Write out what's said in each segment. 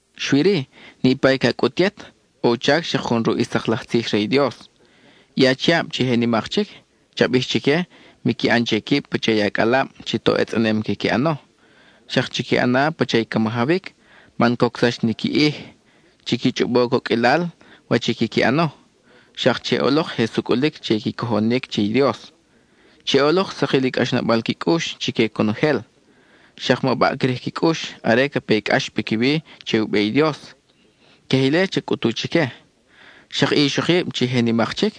Xui-ri, niʼpa i ca cʼut yet, ʼo u chac xak jun ruʼ i sak laj tzij re i Dios. I achiab chi je nimak chic, cha bij chique miqui ʼan che quib pacha i acʼalab chi toʼ etzʼanem quiqui ʼano, xak chiqui ʼana pacha i ca majawic man cocsax ni qui ʼij; chiqui chʼobo coqʼuilal wach i quiqui ʼano, xak che ʼolok je sucʼulic che i qui cojonic che i Dios; che ʼolok sakil u cʼaxnabal qui cʼux chique conojel, xak ma baʼcrij qui cʼux are ca pe i cʼax piquiwi che u be i Dios. Queje ile cha cʼutu chique. Xak i ixokib chi je nimak chic,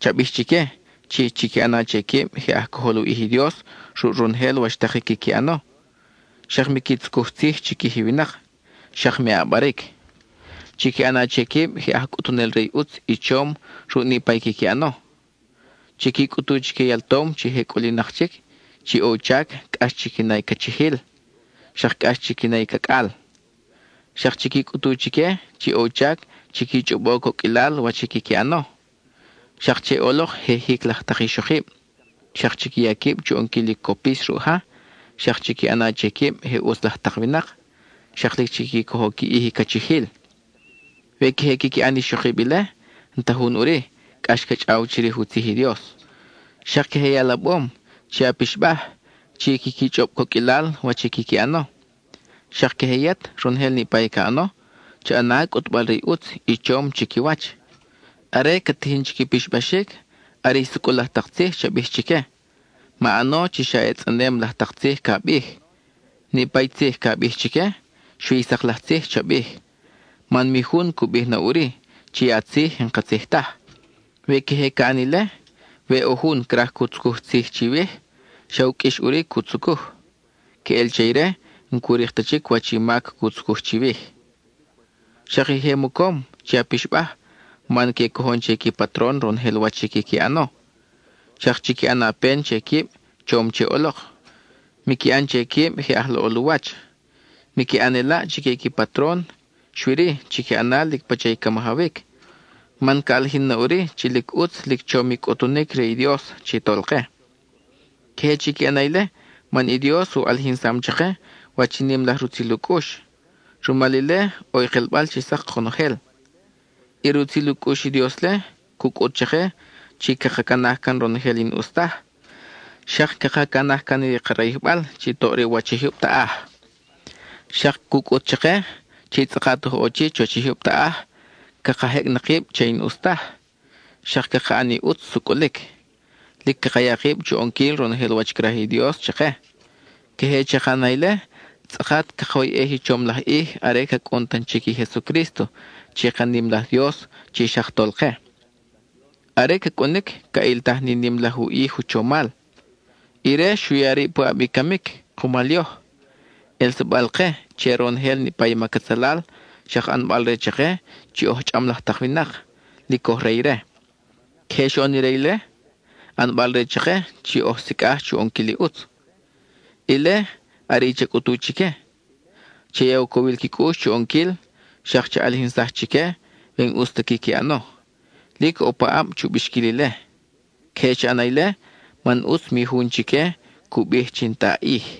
cha bij chique chi chiqui ʼana che quib je aj cojol u ʼij i Dios ruʼ ronojel wach tak i quiqui ʼano, xak miqui tzucuj tzij chiquij i winak, xak me ʼabaric. Chiqui ʼana che quib je aj cʼutunel re i ʼutz i chom ruʼ niʼpa i quiqui ʼano. Chiqui cʼutu chique i altom chi je cʼulinak chic chi ʼo u chac cʼax chiqui na i cachijil, xak cʼax chiqui na i cacʼal. Xak chiqui cʼutu chique chi ʼo u chac chiqui chʼobo coqʼuilal wach i quiqui ʼano, xak che ʼolok je jic laj tak ixokib, xak chiqui ya quib chu ʼonquil i copis ruʼ ja, xak chiqui ʼana che quib je ʼutz laj tak winak, xak lic chiqui cojo qui ʼij i cachijil. We queje quiqui ʼan i ixokib ile, n-ta jun ʼuri cʼax ca chʼaw chirij u tzij i Dios. Xak queje i alabom, che a pixbaj chi quiqui chʼob coqʼuilal wach i quiqui ʼano; xak queje yet, ronojel niʼpa i ca ʼano, cha ʼana cʼutbal-re i ʼutz i chom chiquiwach. Are cat tijin chi qui pixbaxic, are i sucʼul laj tak tzij cha bij chique; ma ʼano chi xa ʼetzʼanem laj tak tzij ca bij. Niʼpa i tzij ca bij chique, xui i sak laj tzij cha bij, man mi jun cu bij na ʼuri chi i a tzij n-katzij taj. We queje ca ʼan ile, we ʼo jun craj cu tzucuj tzij chiwij, xa u qʼuix ʼuri cu tzucuj. Queʼel che ire, n-cu rik ta chic wach i mac cu tzucuj chiwij. Xak i je mocom, che a pixbaj man que cojon che qui patron ronojel wach i quiqui ʼano, xak chiqui ʼana pen che quib chom che ʼolok; miqui ʼan che quib je aj laʼol u wach. Miqui ʼan i elaʼ chique i qui patron, xui-ri, chiqui ʼana lic pacha i ca majawic, man ca ʼalijin na ʼuri chi lic ʼutz lic chom i cʼutunic re i Dios chi Tolke. Queje chiqui ʼana ile man i Dios u ʼalijinsam chake wach i nim laj rutzil u cʼux; rumal ile, ʼo i kelbal chi sak konojel. I rutzil u cʼux i Dios-le, cu cʼut chake chi caka canaj can ronojel i n-ʼus taj, xak caka canaj can i ka rayijbal chi toʼ re u wach i jyub taʼaj. Xak cu cʼut chake, chi tzʼakat oj ʼo chi chuwach i jyub taʼaj, caka jecʼ na kib che i n-ʼus taj, xak caka ʼan i ʼutz sucʼulic; lic caka ya kib chu ʼonquil ronojel wach craj i Dios chake. Queje chaka ʼana ile, tzʼakat cakoyʼej i chom laj ʼij are ca cʼun tan chic i Jesucrísto chi ka nim laj Dios chi xak Tolke. Are ca cʼunic ca ʼiltaj ni nim laj u ʼij u chomal. Ire xu ya rib puʼab i camic kumal yoj, ʼelsabal-ke che ronojel i mac atzalal, xak ʼanbal-re chake chi oj chʼam laj tak winak, lic oj re ire. Queje xoʼon ire ile, ʼanbal-re chake chi oj sicʼaj chu ʼonquil i ʼutz. Ile, are i cha cʼutu chique. Cha ya u cowil qui cʼux chu ʼonquil, xak cha ʼalijinsaj chique we n-ʼus ta quiqui ʼano; lic ʼo paʼab chu bixquil ile. Queje cha ʼana ile man ʼutz mi jun chique cu bij chi n-ta a ʼij.